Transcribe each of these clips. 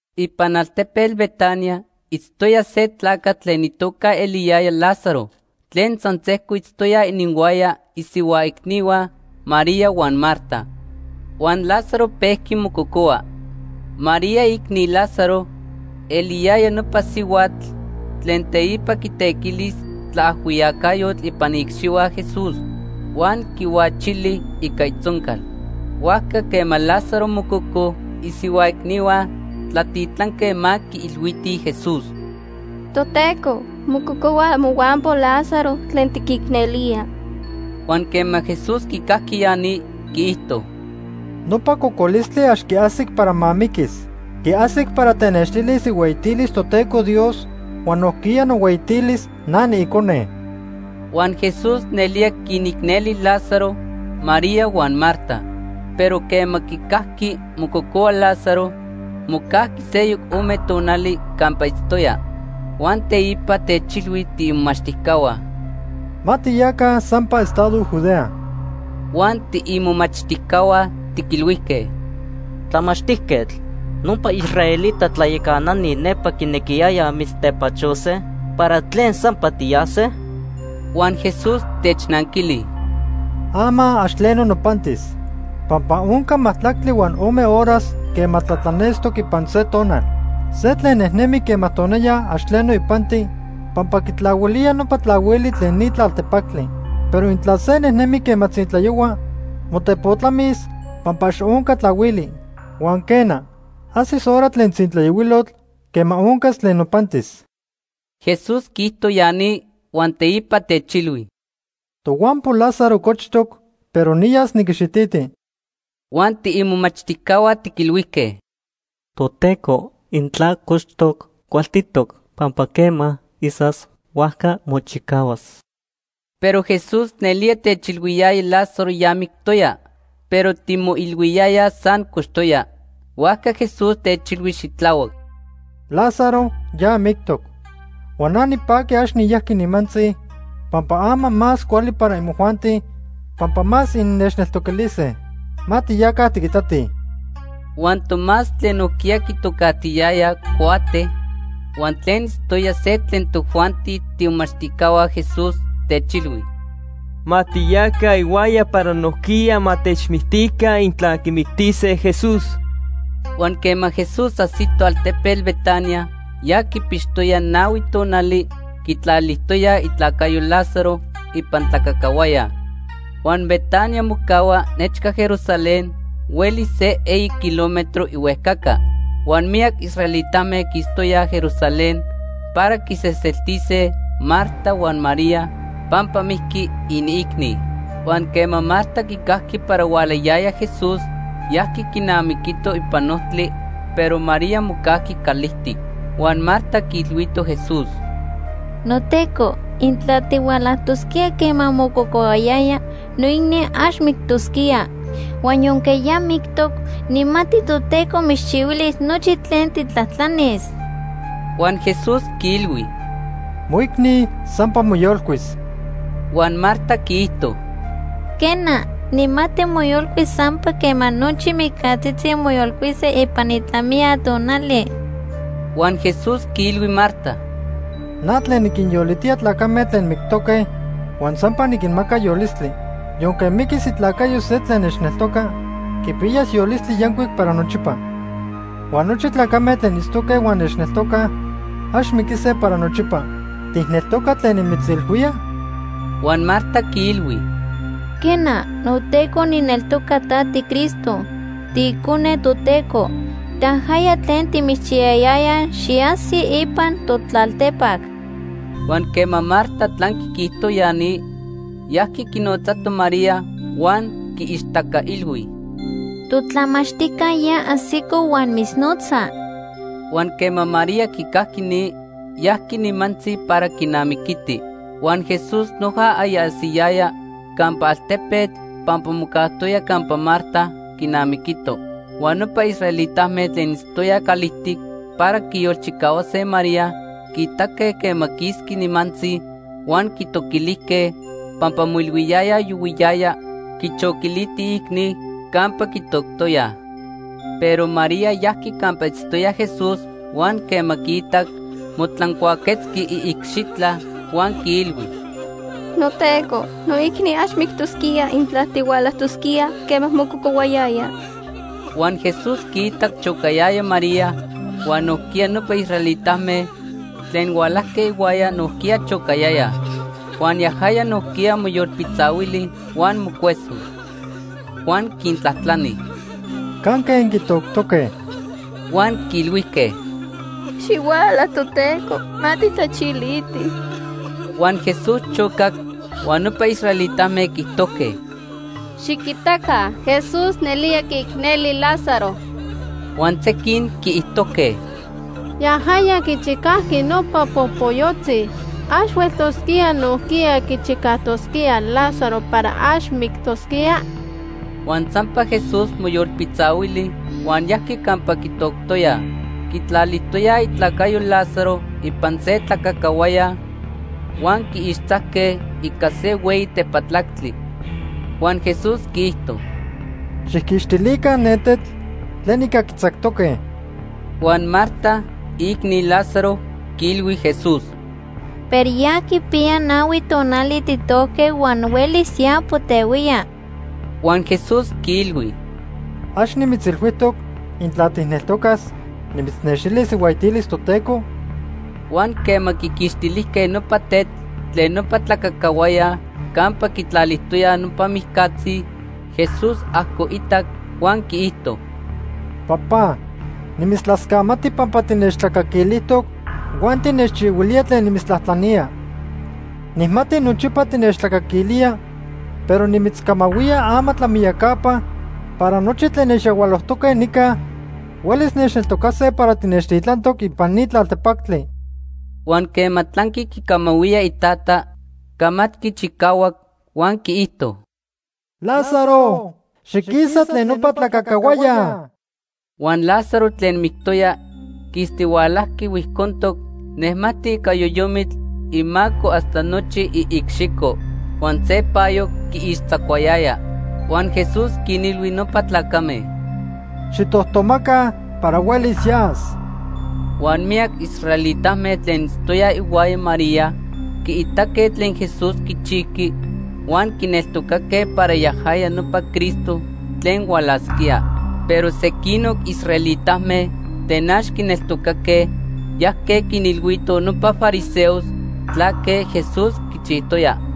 Ipan altepetl Betania itztoya se tlacatl tlen itoca eliyaya Lázaro tlen san sejco itztoya ininhuaya isihua icnihua, María huan Marta. Huan Lázaro pejqui mococohua. (María, iicni Lázaro, eliyaya nopa sihuatl tlen teipa quitequilis tlaajhuiyacayotl ipan iicxihua Jesús huan quihuachili ica itzoncal.) Huajca quema Lázaro mococo, isihua icnihua tlatitlanque ma quiilhuitij Jesús: ―Toteco, mococohua mohuampo Lázaro tlen tiquicnelía. Huan quema Jesús quicajqui ya ni, quiijto: ―Nopa cocolistli ax quiajsic para ma miquis. Quiajsic para tenextilis ihueyitilis Toteco Dios huan nojquiya nohueyitilis na niIcone. Huan Jesús nelía quinicneli Lázaro, María huan Marta. Pero quema quicajqui mococohua Lázaro, mocajqui seyoc ome tonali campa itztoya. Huan teipa techilhui tiimomachtijcahua: ―Ma tiyaca sampa estado Judea. Huan tiimomachtijcahua tiquilhuijque: ―Tlamachtijquetl, nopa israelita tlayacanani nepa quinequiyayaj mitztepachose. ¿Para tlen sampa tiyase? Huan Jesús technanquili: ―Ama ax tleno nopantis. Pampa onca majtlactli huan ome horas quema tlatlanestoc ipan se tonal. Se tlen nejnemi quema tonaya ax tleno ipanti pampa quitlahuilía nopa tlahuili tlen ni tlaltepactli. Pero intla se nejnemi quema tzintlayohua, motepotlamis pampa ax onca tlahuili. Huan quena, ajsis hora tlen tzintlayohuilotl quema oncas tlen nopantis. Jesús quiijto ya ni huan teipa techilhui: ―Tohuampo Lázaro cochtoc, pero niyas niquixititi. Huan tiimomachtijcahua tiquilhuijque: ―Toteco, intla cochtoc, cualtitoc, pampa quema isas, huajca mochicahuas. Pero Jesús nelía techilhuiyaya Lázaro ya mictoya, pero timoilhuiyayaj san cochtoya. Huajca Jesús techilhui xitlahuac: ―Lázaro ya mictoc. Huan na nipaqui ax niyajqui nimantzi pampa ama más cuali para imojuanti pampa más innechneltoquilise. Ma tiyaca tiquitatij. Huan Tomás tlen nojquiya quitocajtiyaya “Cuate” huan tlen itztoya se tlen tojuanti tiimomachtijcahua Jesús, techilhui: ―Ma tiyaca ihuaya para nojquiya ma techmictica intla quimictise Jesús. Huan quema Jesús ajsito altepetl Betania, ya quipixtoya nahui tonali quitlalijtoyaj itlacayo Lázaro ipan tlacacahuaya. Huan Betania mocahua nechca Jerusalén, huelis se eyi kilómetro ihuejcaca. Huan miyac israelitame quistoyaj Jerusalén para quinseseltise Marta huan María pampa mijqui iniicni. Huan quema Marta quicajqui para hualayaya Jesús, yajqui quinamiquito ipan ojtli, pero María mocajqui calijtic. Huan Marta quiilhuito Jesús: ―NoTeco, intla tihualajtosquía quema mococohuayaya, noicni ax mictosquía. Huan yonque ya mictoc, nijmati Toteco mitzchihuilis nochi tlen tijtlajtlanis. Huan Jesús quiilhui: ―Moicni sampa moyolcuis. Huan Marta quiijto: ―Quena, nijmati moyolcuis sampa quema nochi mijcatzitzi moyolcuise ipan itlamiya tonali. Huan Jesús quiilhui Marta: ―Na tlen niquinyolitía tlacame tlen mictoque huan sampa niquinmaca yolistli. Yonque miquis itlacayo se tlen nechneltoca, quipiyas yolistli yancuic para nochipa. Huan nochi tlacame tlen itztoque huan nechneltocaj ax miquise para nochipa. ¿Tijneltoca tlen nimitzilhuía? Huan Marta quiilhui: ―Quena, noTeco nijneltoca ta tiCristo, tiIcone Toteco. Tajaya tlen timitzchiyayayaj xiajsi ipan totlaltepac. Huan quema Marta tlanqui quiijto ya ni, yajqui quinotzato María huan quiixtacailhui: ―Totlamachtijca ya ajsico huan mitznotza. Huan quema María quicajqui ni, yajqui nimantzi para quinamiquiti. Huan Jesús noja aya ajsiyaya campa altepetl pampa mocajtoya campa Marta quinamiquito. Huan nopa israelitame tlen itztoyaj calijtic para quiyolchicahuase María quiitaque quema quisqui nimantzi huan quitoquilijque pampa moilhuiyayaj yohuiyaya quichoquiliti iicni campa quitoctoyaj. Pero María yajqui campa itztoya Jesús huan quema quiitac, motlancuaquetzqui iicxitla huan quiilhui: ―NoTeco, noicni ax mictosquía intla tihualajtosquía quema mococohuayaya. Huan Jesús quiitac chocayaya María, huan nojquiya nopa israelitame tlen hualajque ihuaya nojquiya chocayayaj. Huan yajaya nojquiya moyolpitzahuili huan mocueso. Huan quintlajtlani: ―¿Canque inquitoctoque? Huan quiilhuijque: ―Xihuala, Toteco, ma tijtlachilitij. Huan Jesús chocac. Huan nopa israelitame quiijtojque: ―Xiquitaca, Jesús nelía quiicneli Lázaro. Huan sequin quiijtojque: ―Yajaya quichicajqui nopa popoyotzi. ¿Ax hueltosquía nojquiya quichicajtosquía Lázaro para ax mictosquía? Huan sampa Jesús moyolpitzahuili huan yajqui campa quitoctoyaj. Quitlalijtoyaj itlacayo Lázaro ipan se tlacajcahuaya huan quiixtzajque ica se hueyi tepatlactli. Huan Jesús quiijto: ―Xijquixtilica ne tetl tlen ica quitzactoque. Huan Marta, iicni Lázaro, quiilhui Jesús: ―Pero ya quipiya nahui tonali tijtojque huan huelis ya potehuía. Huan Jesús quiilhui: ―¿Ax nimitzilhuijtoc, intla tijneltocas, nimitznextilis ihueyitilis Toteco? Huan quema quiquixtilijque nopa tetl tlen nopa tlacajcahuaya campa quitlalijtoyaj nopa mijcatzi, Jesús ajcoitac huan quiijto: ―Papá, nimitztlascamati pampa tinechtlacaquilijtoc huan tinechchihuilía tlen nimitztlajtlanía. Nijmati nochipa tinechtlacaquilía, pero nimitzcamahuía ama tlamiyacapa para nochi tlen nechyahualojtoque nica huelis nechneltocase para tinechtitlantoc ipan ni tlaltepactli. Huan quema tlanqui quicamahuía iTata, camatqui chicahuac huan quiijto: ―Lázaro, xiquisa tlen nopa tlacajcahuaya. Huan Lázaro tlen mictoya quistihualajqui huijcontoc nejmajtic ica yoyomitl imaco hasta nochi iicxico. Huan se payo quiixtzacuayaya. Huan Jesús quinilhui nopa tlacame: ―Xijtojtomaca para huelis yas. Huan miyac israelitame tlen itztoyaj ihuaya María quiitaque tlen Jesús quichijqui huan quineltocaque para yajaya nopa Cristo tlen hualasquía. Pero sequinoc israelitame tlen ax quineltocaque yajque quinilhuitoj nopa fariseos tlaque Jesús quichijtoya.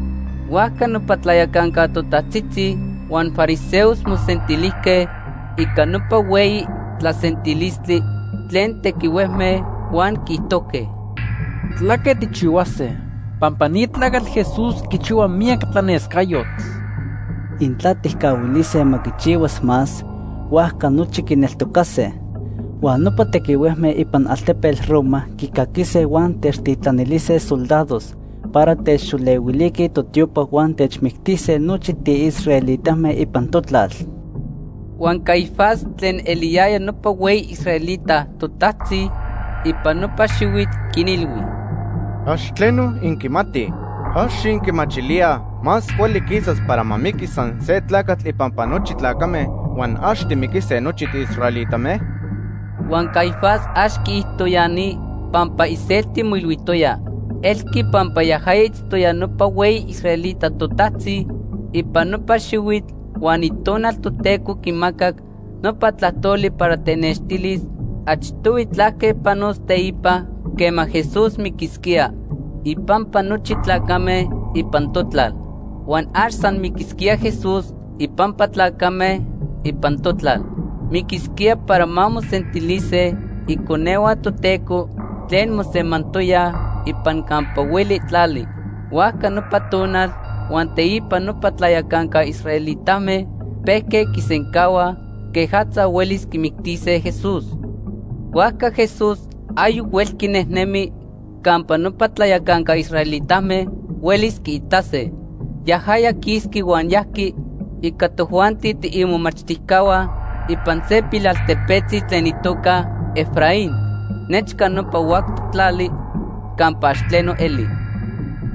Huajca nopa tlayacanca totajtzitzi huan fariseos mosentilijque ica nopa hueyi tlasentilistli tlen tequihuejme huan quiijtojque: ―¿Tlaque tijchihuase? Pampa ni tlacatl Jesús quichihua miyac tlanescayotl. Intla tijcahuilise ma quichihuas más, huajca nochi quineltocase. Huan nopa tequihuejme ipan altepetl Roma quicaquise huan techtitlanilise soldados para techxolehuiliquij totiopa huan techmictise nochi tiisraelitame ipan totlal. Huan Caifás tlen eliyaya nopa hueyi israelita totajtzi ipan nopa xihuitl quinilhui: ―Ax tleno inquimatij. ¿Ax inquimachilíaj más cuali quisas para ma miquis san se tlacatl ipampa nochi tlacame huan ax timiquise nochi tiisraelitame? Huan Caifás ax quiijto ya ni pampa iselti moilhuijtoya. Elqui pampa yajaya itztoya nopa hueyi israelita totajtzi ipan nopa xihuitl huan Itonal Toteco quimacac nopa tlajtoli para tenextilis achtohui tlaque panos teipa quema Jesús miquisquía ipampa nochi tlacame ipan totlal. Huan ax san miquisquía Jesús ipampa tlacame ipan totlal. Miquisquía para ma mosentilise iconehua Toteco tlen mosemantoyaj ipan campa hueli tlali. Huajca nopa tonal huan teipa nopa tlayacanca israelitame pejque quisencahuaj quejatza huelis quimictise Jesús. Huajca Jesús ayoc huelqui nejnemi campa nopa tlayacanca israelitame huelis quiitase. Yajaya quisqui huan yajqui ica tojuanti tiimomachtijcahua ipan se pilaltepetzi tlen itoca Efraín nechca nopa huactoc tlali campa ax tleno eli.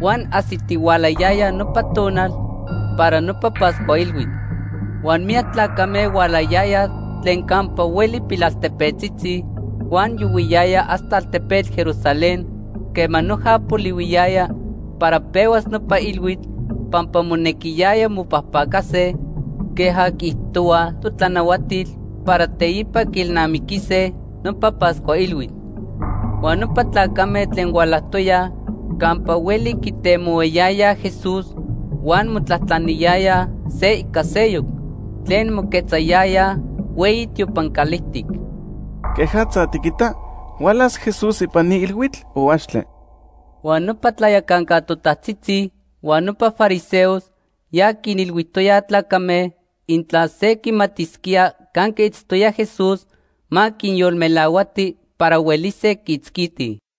Huan ajsitihualayaya nopa tonal para nopa Pascua Ilhuitl. Huan miyac tlacame hualayayaj tlen campa hueli pilaltepetzitzi huan yohuiyayaj hasta altepetl Jerusalén quema noja polihuiyaya para pehuas nopa ilhuitl pampa monequiyaya mopajpacase queja quiijtohuaj totlanahuatil para teipa quiilnamiquise nopa Pascua Ilhuitl. Huan nopa tlacame tlen hualajtoyaj campa hueli quitemohuayayaj Jesús huan motlajtlaniyayaj se ica seyoc tlen moquetzayayaj hueyi tiopan calijtic: ―¿Quejatza tiquita? ¿Hualas Jesús ipan ni ilhuitl o axtle? Huan nopa tlayacanca totajtzitzi huan nopa fariseos ya quinilhuijtoyaj tlacame intla se quimatisquía canque itztoya Jesús, ma quinyolmelahuatij para huelise quiitzquitij.